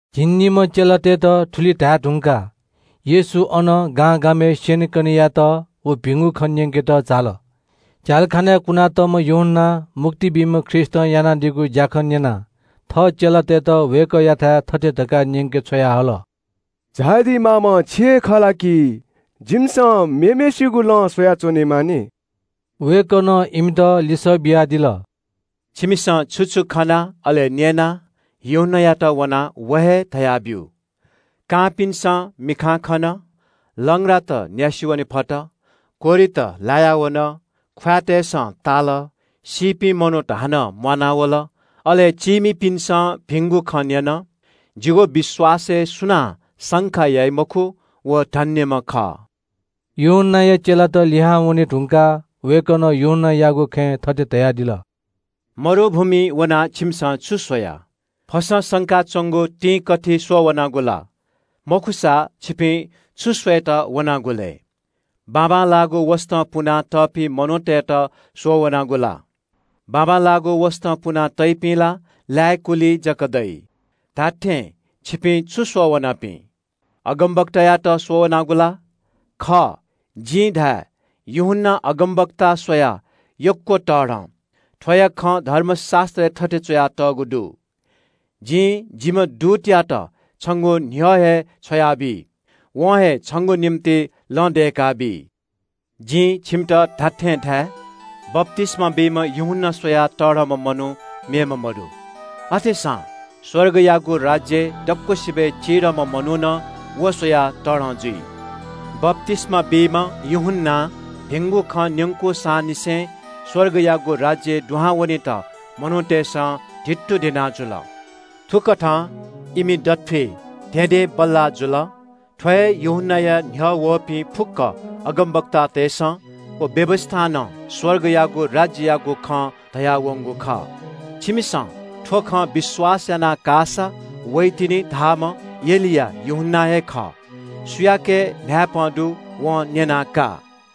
झिंनिम्‍ह चेलातय्‌त थुलि धाये धुंकाः येशू अनं गांगामय् स्‍यनेकने यायेत व भिंगु खँ न्‍यंकेत झाल। झ्‍यालखानाय् कुनातःम्‍ह यूहन्‍नां मुक्ति बीम्‍ह ख्रीष्‍टं यानादीगु ज्‍याखँ न्‍यनाः थः चेलातय्‌त वय्‌कःयाथाय् थथे धकाः न्‍यंके छ्वयाहल। “झायादी माःम्‍ह छि हे खः ला कि जिमिसं मेम्‍हय्‌सिगु लँ स्‍वयाच्‍वनेमाः नि?” वय्‌कलं इमित लिसः बियादिल – “छिमिसं छु छु खना अले न्‍यना यूहन्‍नायात वनाः व हे धयाब्‍यु। कांपिन्‍सं मिखां खन, लंग्रात न्‍यासि वने फत, कोह्रित लाया वन, ख्‍वाँय्‌तय्‌सं ताल, सीपिं मनूत हानं म्‍वानावल, अले चीमिपिन्‍सं भिंगु खँ न्‍यन। जिगु विश्‍वासय् सुनां शंका याइ मखु, व धन्‍यम्‍ह खः।” यूहन्‍नाया चेलात लिहां वने धुंकाः वय्‌कलं यूहन्‍नायागु खँय् थथे धयादिल – “मरुभूमिइ वनाः छिमिसं छु स्‍वया? फसं संका च्‍वंगु तिंकथि स्‍वःवनागु ला? मखुसा छिपिं छु स्‍वयेत वनागु लय्? बाबांलाःगु वसतं पुनातःपिं मनूतय्‌त स्‍वःवनागु ला? बाबांलाःगु वसतं पुना तइपिं ला लाय्‌कुलिइ जक दइ। धात्‍थें छिपिं छु स्‍वः वनापिं? अगमवक्तायात स्‍वःवनागु ला? खः, जिं धाये – यूहन्‍ना अगमवक्ता स्‍वयाः यक्‍व तःधं। थ्‍वयागु खँ धर्मशास्‍त्रय् थथे च्‍वयातःगु दु – “‘जिं जिम्‍ह दूतयात छंगु न्‍ह्यः हे छ्वयाबी। वं हे छंगु निंतिं लँ दय्‌काबी।’” “जिं छिमित खःगु खँ धाये – बप्‍तिस्‍मा बीम्‍ह यूहन्‍ना स्‍वयाः तःधंम्‍ह मनू मेम्‍ह मदु। अथेसां स्‍वर्गयागु राज्‍यय् दक्‍वसिबय् चिधंम्‍ह मनू नं व स्‍वयाः तःधं जुइ। बप्‍तिस्‍मा बीम्‍ह यूहन्‍नां भिंगु खँ न्‍यंकूसांनिसें स्‍वर्गयागु राज्‍यय् दुहां वनेत मनूतय्‌सं धित्तुधिनाः जुल। थुकथं इमि दथुइ धेंधेंबल्‍लाः जुल। थ्‍व हे यूहन्‍नाया न्‍ह्यः वःपिं फुक्‍क अगमवक्तातय्‌सं व व्‍यवस्‍थां नं स्‍वर्गयागु राज्‍ययागु खँ धयावंगु खः। छिमिसं थ्‍व खँ विश्‍वास याना काःसा वइतिनि धाःम्‍ह एलिया यूहन्‍ना हे खः। सुयाके न्‍हाय्‌पं दु वं न्‍यना का।”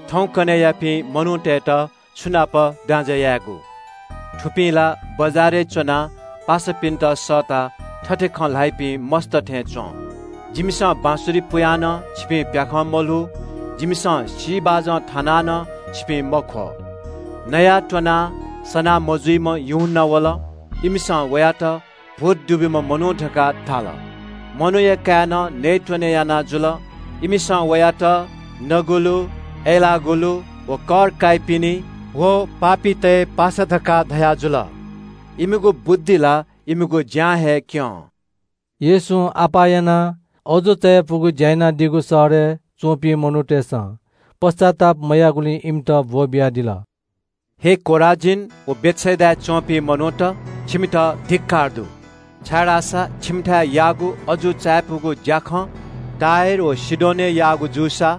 “थौंकन्‍हय्‌यापिं मनूतय्‌त छु नाप दाँजय् यायेगु? थुपिं ला बजारय् च्‍वनाः पासापिन्‍त सःताः थथे खँ ल्‍हाइपिं मस्‍त थें च्‍वं – “‘जिमिसं बाँसुरी पुयाः नं छिपिं प्‍याखं मल्‍हू, जिमिसं सी बाजं थानाः नं छिपिं मख्‍वः।’ “नयाःत्‍वनाः सनामजुइम्‍ह यूहन्‍ना वल। इमिसं वयात – ‘भूत दुब्‍यूम्‍ह मनू’ धकाः धाल। मनूया काय्‌नं नयेत्‍वने याना जुल। इमिसं वयात – ‘नगुलु, अय्‌लाःगुलुत व कर काइपिनि व पापीतय् पासा’ धकाः धयाजुल। इमिगु बुद्धि ला इमिगु ज्‍यां हे क्‍यं।” येशूं अप्‍वः यानाः अजू चायापुगु ज्‍या यानादीगु शहरय् च्‍वंपिं मनूतय्‌सं पश्‍चाताप मयाःगुलिं इमित ब्‍वःबियादिल। “हे खोराजीन व बेथसेदाय् च्‍वंपिं मनूत, छिमित धिक्‍कार दु, छाय्‌धाःसा छिमिथाय् याःगु अजू चायापुगु ज्‍याखँ टुरोस व सीदोनय् याःगु जूसा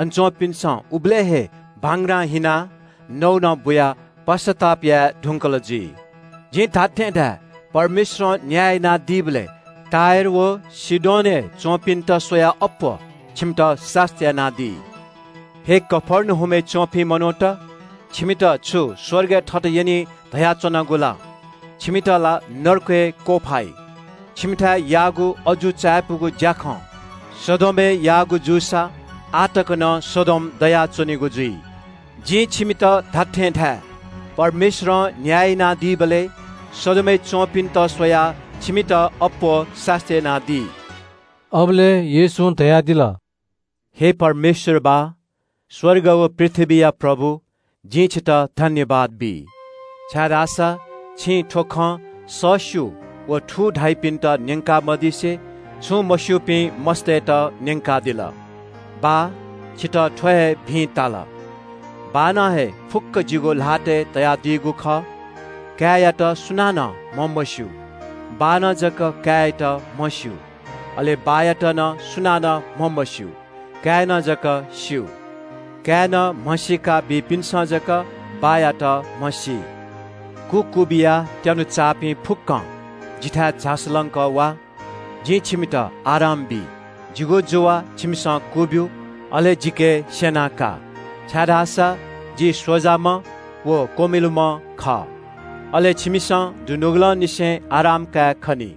अन च्‍वंपिन्‍सं उबलय् हे भांग्रां हिनाः नौनं बुयाः पश्‍चाताप याये धुंकल जुइ। जिं छिमित धाये – परमेश्‍वरं न्‍याय यानादीबलय् टुरोस व सीदोनय् च्‍वंपिन्‍त स्‍वयाः अप्‍वः छिमित सास्‍ती यानादी। “हे कफर्नहुमय् च्‍वंपिं मनूत, छिमित छु स्‍वर्गय् थत यनी धयाच्‍वनागु ला? छिमित ला नरकय् क्‍वफाइ। छिमिथाय् याःगु अजू चायापुगु ज्‍याखँ सदोमय् याःगु जूसा आः तक नं सदोम दयाच्‍वनीगु जुइ। जिं छिमित धाये – परमेश्‍वरं न्‍याय यानादीबलय् सदोमय् च्‍वंपिन्‍त स्‍वयाः छिमित अप्‍वः सास्‍ती यानादी।” अबलय् येशूं धयादिल – “हे परमेश्‍वर बाः, स्‍वर्ग व पृथ्‍वीया प्रभु, जिं छितः सुभाय् बी, छाय्‌धाःसा छिं थ्‍व खँ सःस्‍यू व थू धाइपिन्‍त न्‍यंका मदिसे छुं मस्‍यूपिं मस्‍तय्‌त न्‍यंकादिल। बाः छितः थ्‍व हे भिं ताल।” “बाःनं हे फुक्‍क जिगु ल्‍हातय् तयादीगु खः। काय्‌यात सुनानं म्‍हमस्‍यू, बाःनं जक काय्‌यात म्‍हस्‍यू। अले बाःयात नं सुनानं म्‍हमस्‍यू, काय्‌नं जक स्‍यू। काय्‌नं म्‍हसीका ब्‍यूपिन्‍सं जक बाःयात म्‍हसी।” “कु क्‍वबिया त्‍यानुचाःपिं फुक्‍कं जिथाय् झासु लंकः वा, जिं छिमित आराम बी। जिगु जुवा छिमिसं क्‍वब्‍यु, अले जिके स्‍यना का, छाय्‌धाःसा जि स्‍वजाम्‍ह व क्‍वमिलुम्‍ह खः। अले छिमिसं दुनुगलंनिसें आराम कायेखनी।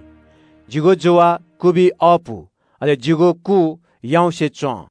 जिगु जुवा क्‍वबी अःपु, अले जिगु कु याउँसे च्‍वं।”